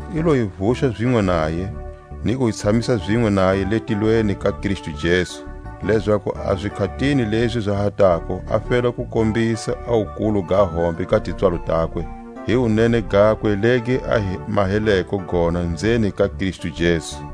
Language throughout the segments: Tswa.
I lo hi vuxa zinwe naye, ni ku hi tshamisa zinwe naye le tilweni ka Kristu Jesu, lezaku a zikhatini lezi za ha tako a fela ku kombisa a wukulu ga hombe ga tipswalo takwe, hi wunene gakwe legi a hi maheleko gona nzeni ka Kristu Jesu.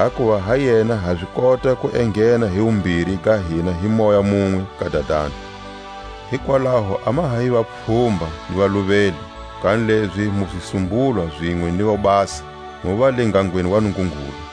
Hakuva ha yena ha zi kota ku enghena hi wumbiri ga hina hi Moya munwe ka Dadani. Hikwalaho a ma ha hi vapfhumba ni valuveli, kanilezi mu zisumbulwa zinwe ni vobasa, mu va le ngangweni wa Nungungulu.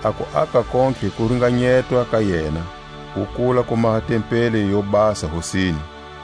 A kuaka kontlhe ku ringanyetwa ka yena, ku kula ku maha tempeli yo basa Hosini;